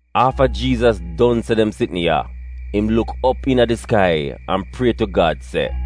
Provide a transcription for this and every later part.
Afta Jiizas don se dem sitn ya, im luk op iina di skai an prie tu Gad se: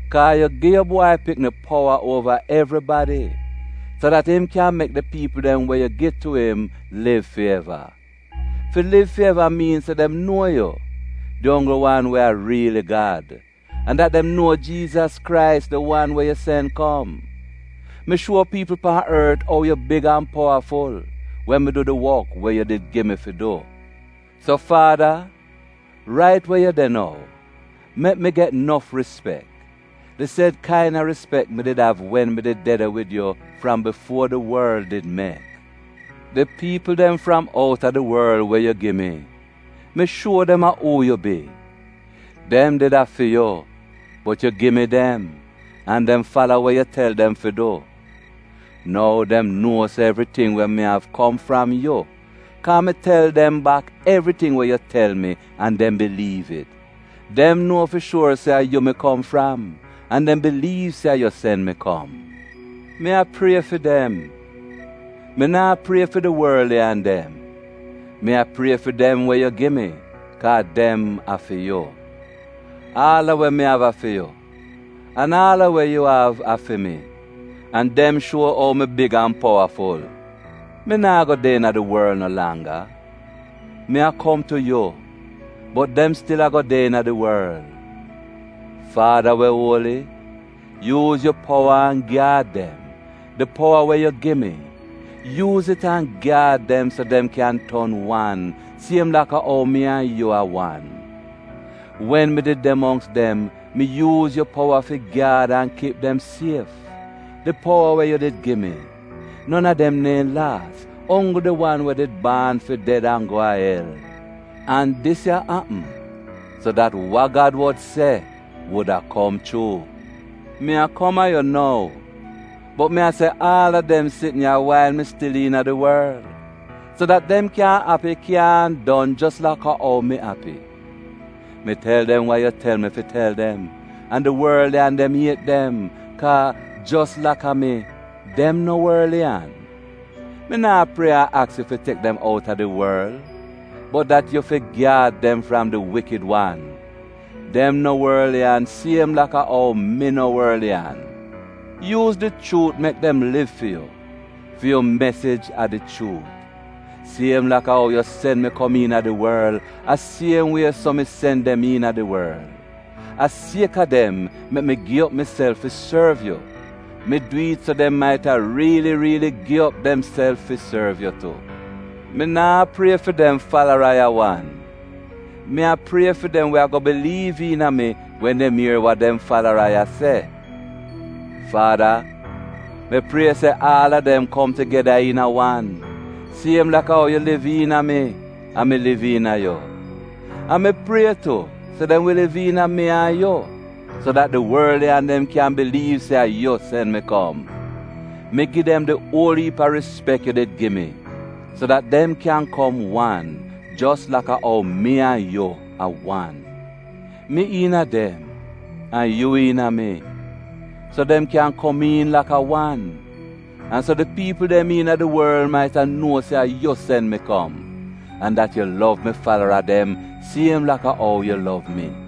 Kaa yu gi yu Bwai Pikni powa uova evribadi, so dat im kyan mek di piipl dem we yu gi tu im liv fi eva. Fi liv fi eva miin se dem nuo yu, di onggl wan we a riili Gad, an dat dem nuo Jiizas Krais, di wan yu sen kom. Mi shuo piipl pan ort ou yu big an powaful, wen mi du di wok we yu did gi mi fi du. So, Faada, rait we yu de nou, mek mi get nof rispek, di sed kaina rispek mi did av wen mi did de de wid yu fram bifuo di worl did mek. “Di piipl dem fram outa di worl we yu gi mi, mi shuo dem a uu yu bi. Dem did a fi yu bot yu gi mi dem, an dem fala we yu tel dem fi du. Nou dem nuo se evriting we mi av kom fram yu, kaa mi tel dem bak evriting we yu tel mi an dem biliiv it. Dem nuo fi shuor se a yu mi kom fram an dem biliiv se a yu sen mi kom. “Mi a prie fi dem. Mi naa prie fi di worliyan dem. Mi a prie fi dem we yu gi mi, kaa dem a fi yu. Aal a we mi av a fi yu, an aal a we yu av a fi mi. An dem shuo ou mi big an powaful. “Mi naa go de iina di worl no langga. Mi a kom tu yu, bot dem stil ago de iina di worl. Faada we uoli, yuuz yu powa an gyaad dem — di powa we yu gi mi — yuuz it an gyaad dem, so dem kyan ton wan, siem laka ou mi an yu a wan. Wen mi did de mongks dem, mi yuuz yu powa fi gyaad an kip dem sief — di powa we yu did gi mi. Non a dem neehn laas, onggl di wan we did baan fi ded an go a el. An dis ya apm so dat wa Gad wod se wuda kom chuu. “Mi a kom a yu nou, bot mi a se aal a dem sitn ya wail mi stil iina di worl, so dat dem kyan api kyaahn don jos laka ou mi api. Mi tel dem we yu tel mi fi tel dem, an di worliyan dem iet dem, kaa, jos laka mi, dem no worliyan. Mi naa prie an aks yu fi tek dem outa di worl, bot dat yu fi gyaad dem fram di wikid wan. Dem no worliyan siem laka ou mi no worliyan. Yuuz di chuut mek dem liv fi yu. Fi yu mesij a di chuut. Siem laka ou yu sen mi kom iina di worl, a siem wie so mi sen dem iina di worl. A sieka dem mek mi gi op miself fi sorv yu. Mi dwi'it so dem maita riili riili gi op demself fi sorv yu tu. “Mi naa prie fi dem falara ya wan. Mi a prie fi dem we ago biliiv iina mi wen dem ier wa dem falara ya se. Faada, mi prie se aal a dem kom tugeda iina wan, siem laka ou yu liv iina mi an mi liv iina yu. An mi prie tu se dem wi liv iina mi an yu, so dat di worliyan dem kyan biliiv se a yu sen mi kom. Mi gi dem di uol iip a rispek yu did gi mi so dat dem kyan kom wan jos laka ou mi an yu a wan: mi iina dem an yu iina mi — so dem kyan komiin laka wan, an so di piipl dem iina di worl maita nuo se a yu sen mi kom, an dat yu lov mi falara dem siem laka ou yu lov mi.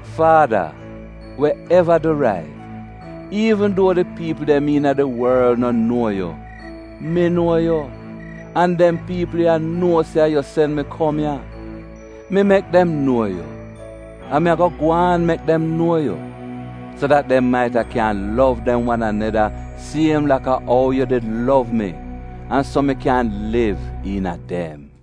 “Faada, we eva du rait, iivn duo di piipl dem iina di worl no nuo yu, mi nuo yu, an dem piipl ya nuo se a yu sen mi kom ya. Mi mek dem nuo yu, an mi ago gwaan mek dem nuo yu, so dat dem maita kyan lov dem wan aneda siem laka ou yu did lov mi, an so mi kyan liv iina a dem.”